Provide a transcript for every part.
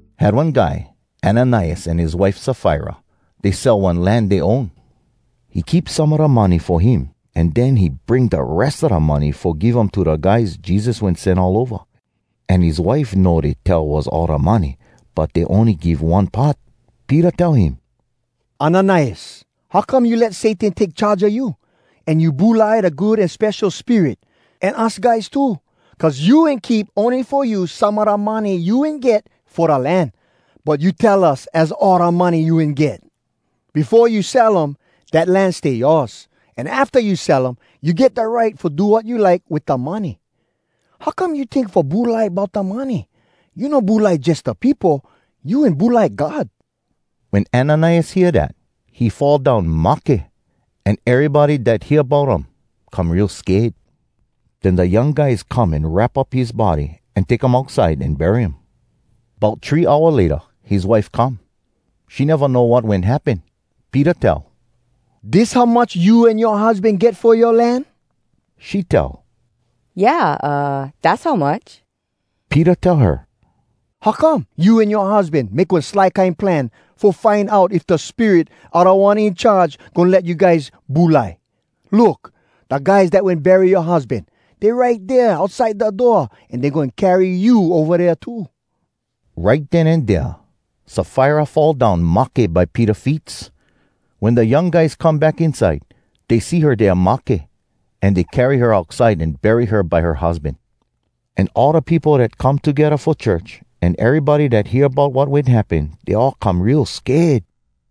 Had one guy Ananias an his wife Safira. Dey sell one land dey own. He keep some a da money fo him, an den he bring da res a da money fo give um to da guys Jesus wen sen all ova. An his wife know dey tell was all da money, but dey ony give one part. Peter tell him, “Ananias, how come you let Satan take charge a you, an you bulai da Good An Spesho Spirit, an us guys too? Cuz you wen keep ony fo you some a da money you wen get fo da land, but you tell us az all da money you wen get! Befo you sell um, dat land stay yoas. An afta you sell um, you get da right fo do wat you like wit da money. How come you tink fo bulai bout da money? You no bulai jus da peopo, you wen bulai God!” Wen Ananias hear dat, he fall down mahke. An erybody dat hear bout um come real sked. Den da young guys come an wrap up his body, an take um outside an bury um. Bout three hour layta his wife come. She neva know wat wen happen. Peter tell, “Dis how much you an yoa husban get fo yoa land?” She tell, “Yeah, aah, dass how much.” Peter tell her, “How come you an yoa husban make one sly kine plan fo find out if da Spirit a Da One In Charge goin let you guys bulai? Look! Da guys dat wen bury yoa husban, dey right dea outside da door, an dey goin carry you ova dea too.” Right den an dea Safira fall down mahke by Peter feets. Wen da young guys come back inside, dey see her dea mahke, an dey carry her outside an bury her by her husban. An all da peopo dat come togedda fo church, an erybody dat hear bout wat wen happen, dey all come real real sked.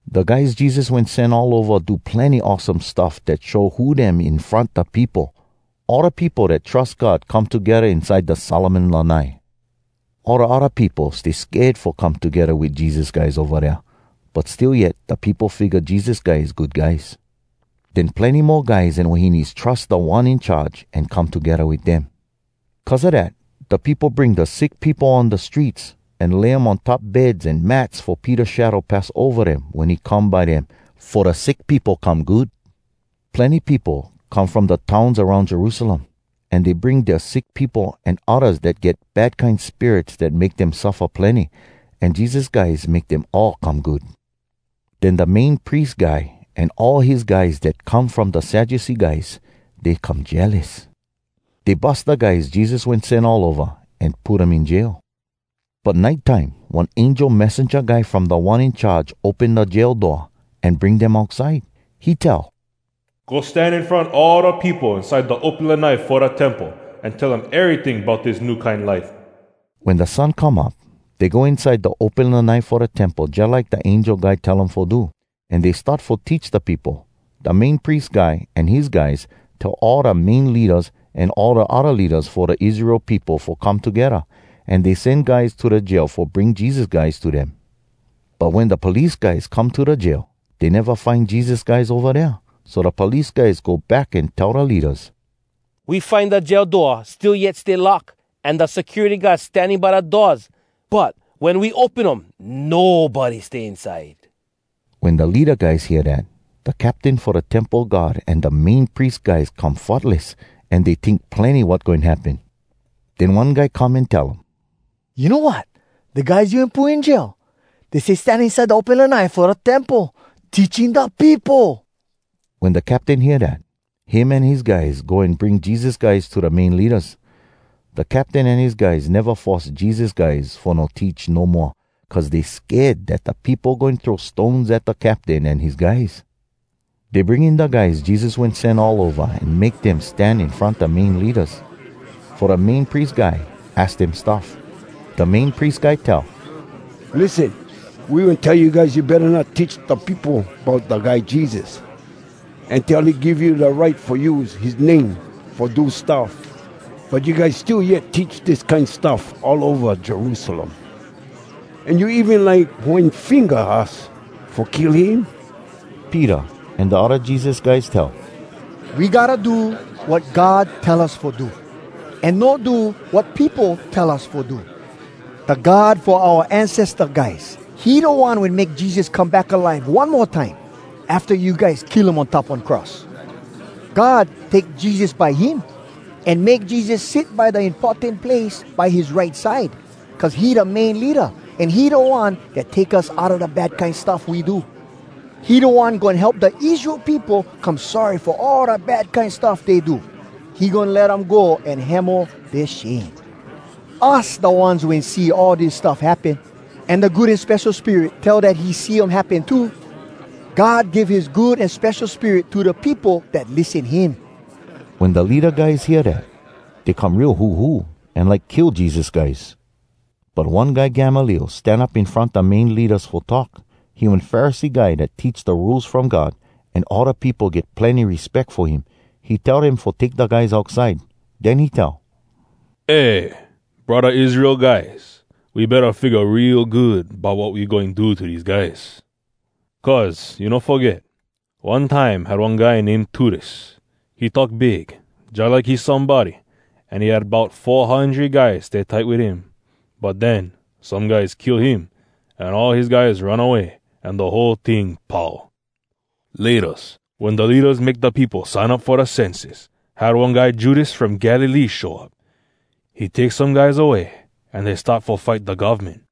Da guys Jesus wen sen all ova do plenny awesome stuff dat show who dem in front da peopo. All da peopo dat trus God come togedda inside da Solomon Lanai. All da odda peopo stay sked fo come togedda wit Jesus guys ova dea, but still yet da peopo figga Jesus guys good guys. Den plenny mo guys an wahines trus Da One In Charge, an come togedda wit dem. Cuz a dat, da peopo bring da sick peopo on da streets, an lay um on top beds an mats fo Peter shadow pass ova dem wen he come by dem fo da sick peopo come good. Plenny peopo come from da towns aroun Jerusalem. An dey bring dea sick peopo an oddas dat get bad kine spirits dat make dem suffa plenny. An Jesus guys make dem all come good. Den da Main Pries Guy an all his guys dat come from da Sadducee guys, dey come jealous. Dey bus da guys Jesus wen sen all ova, an put um in jail. But nite time one angel messenja guy from Da One In Charge open da jail door, an bring dem outside. He tell, “Go stan in front all da peopo inside da open lanai fo da Temple, an tell um eryting bout dis new kine life.” Wen da sun come up, dey go inside da open lanai fo da Temple jalike da angel guy tell um fo do, an dey start fo teach da peopo. Da Main Pries Guy an his guys tell all da main leadas, an all da odda leadas fo da Israel peopo fo come togedda. An dey sen guys to da jail fo bring Jesus guys to dem. But wen da police guys come to da jail, dey neva find Jesus guys ova dea. So da police guys go back an tell da leadas, “We find da jail door still yet stay lock, an da security guard standing by da doors, but wen we open um, nobody stay inside.” Wen da leada guys hear dat, da captain fo da Temple guard an da Main Pries guys come futless, an dey tink plenny wat goin happen. Den one guy come an tell um, “You know wat? Da guys you wen put in jail, dey stay stan inside da open lanai fo da Temple, teaching da peopo!” Wen da captain hear dat, him an his guys go an bring Jesus guys to da main leadas. Da captain an his guys neva force Jesus guys fo no teach no moa, cuz dey sked dat da peopo goin throw stones at da captain an his guys. Dey bring in da guys Jesus wen sen all ova an make dem stan in front da main leadas, fo da Main Pries Guy aks dem stuff. Da Main Pries Guy tell, “Lissen! We wen tell you guys you betta not teach da peopo bout da guy Jesus, an tell he give you da right fo use his name fo do stuff. But you guys still yet teach dis kine stuff all ova Jerusalem. An you even like poin finga us fo kill him!” Peter an da odda Jesus guys tell, “We gotta do wat God tell us fo do, an no do wat peopo tell us fo do! Da God fo oua ancesta guys, he da One wen make Jesus come back alive one mo time, afta you guys kill him on top one cross. God take Jesus by him, an make Jesus sit by da importan place by his right side, cuz he da Main Leada, an he da One dat take us outa da bad kine stuff we do. He da One goin help da Israel peopo come sorry fo all da bad kine stuff dey do. He goin let um go an hemo dea shame. Us da ones wen see all dis stuff happen, an da Good An Spesho Spirit tell dat he see um happen too. God give his Good An Spesho Spirit to da peopo dat lissen him.” Wen da leada guys hea dat, dey come real huhu, an like kill Jesus guys. But one guy Gamaliel stan up in front da main leadas fo talk. He one Pharisee guy dat teach da Rules From God, an all da peopo get plenny respeck fo him. He tell dem fo take da guys outside. Den he tell, “Eh! Braddah Israel guys, we betta figga real good bout wat we goin do to dese guys. Cuz you no foget? One time had one guy name Teudas. He talk big, jalike he somebody, an he had bout four hundred guys stay tight wit him. But den some guys kill him, an all his guys run away, an da whole ting pau. Laytas, wen da leadas make da peopo sign up fo da census, had one guy Judas from Galilee show up. He take some guys away, an dey start fo fight da govmen.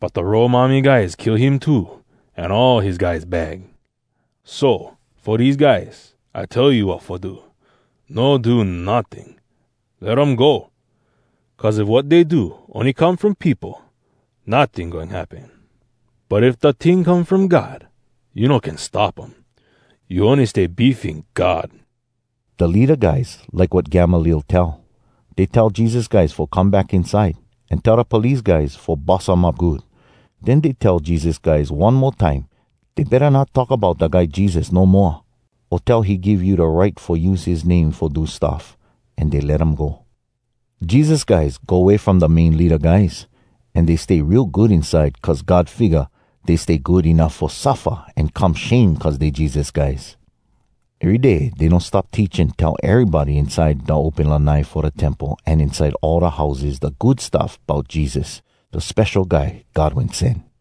But da Rome army guys kill him too, an all his guys bag. So, fo dese guys, I tell you wat fo do. No do notting! Let um go! Cuz if wat dey do ony come from peopo, notting goin happen. But if da ting come from God, you no can stop um. You ony stay beefing God.” Da leada guys like wat Gamaliel tell. Dey tell Jesus guys fo come back inside, an tell da police guys fo bus um up good. Den dey tell Jesus guys one mo time dey betta not talk bout da guy Jesus no moa, o tell he give you da right fo use his name fo do stuff. An dey let dem go. Jesus guys go way from da main leada guys. An dey stay real good inside cuz God figga dey stay good enuff fo suffa an come shame cuz dey Jesus guys. Ery day dey no stop teach an tell erybody inside da open lanai fo da Temple an inside all da houses da Good Stuff bout Jesus, da Spesho Guy God Wen Sen.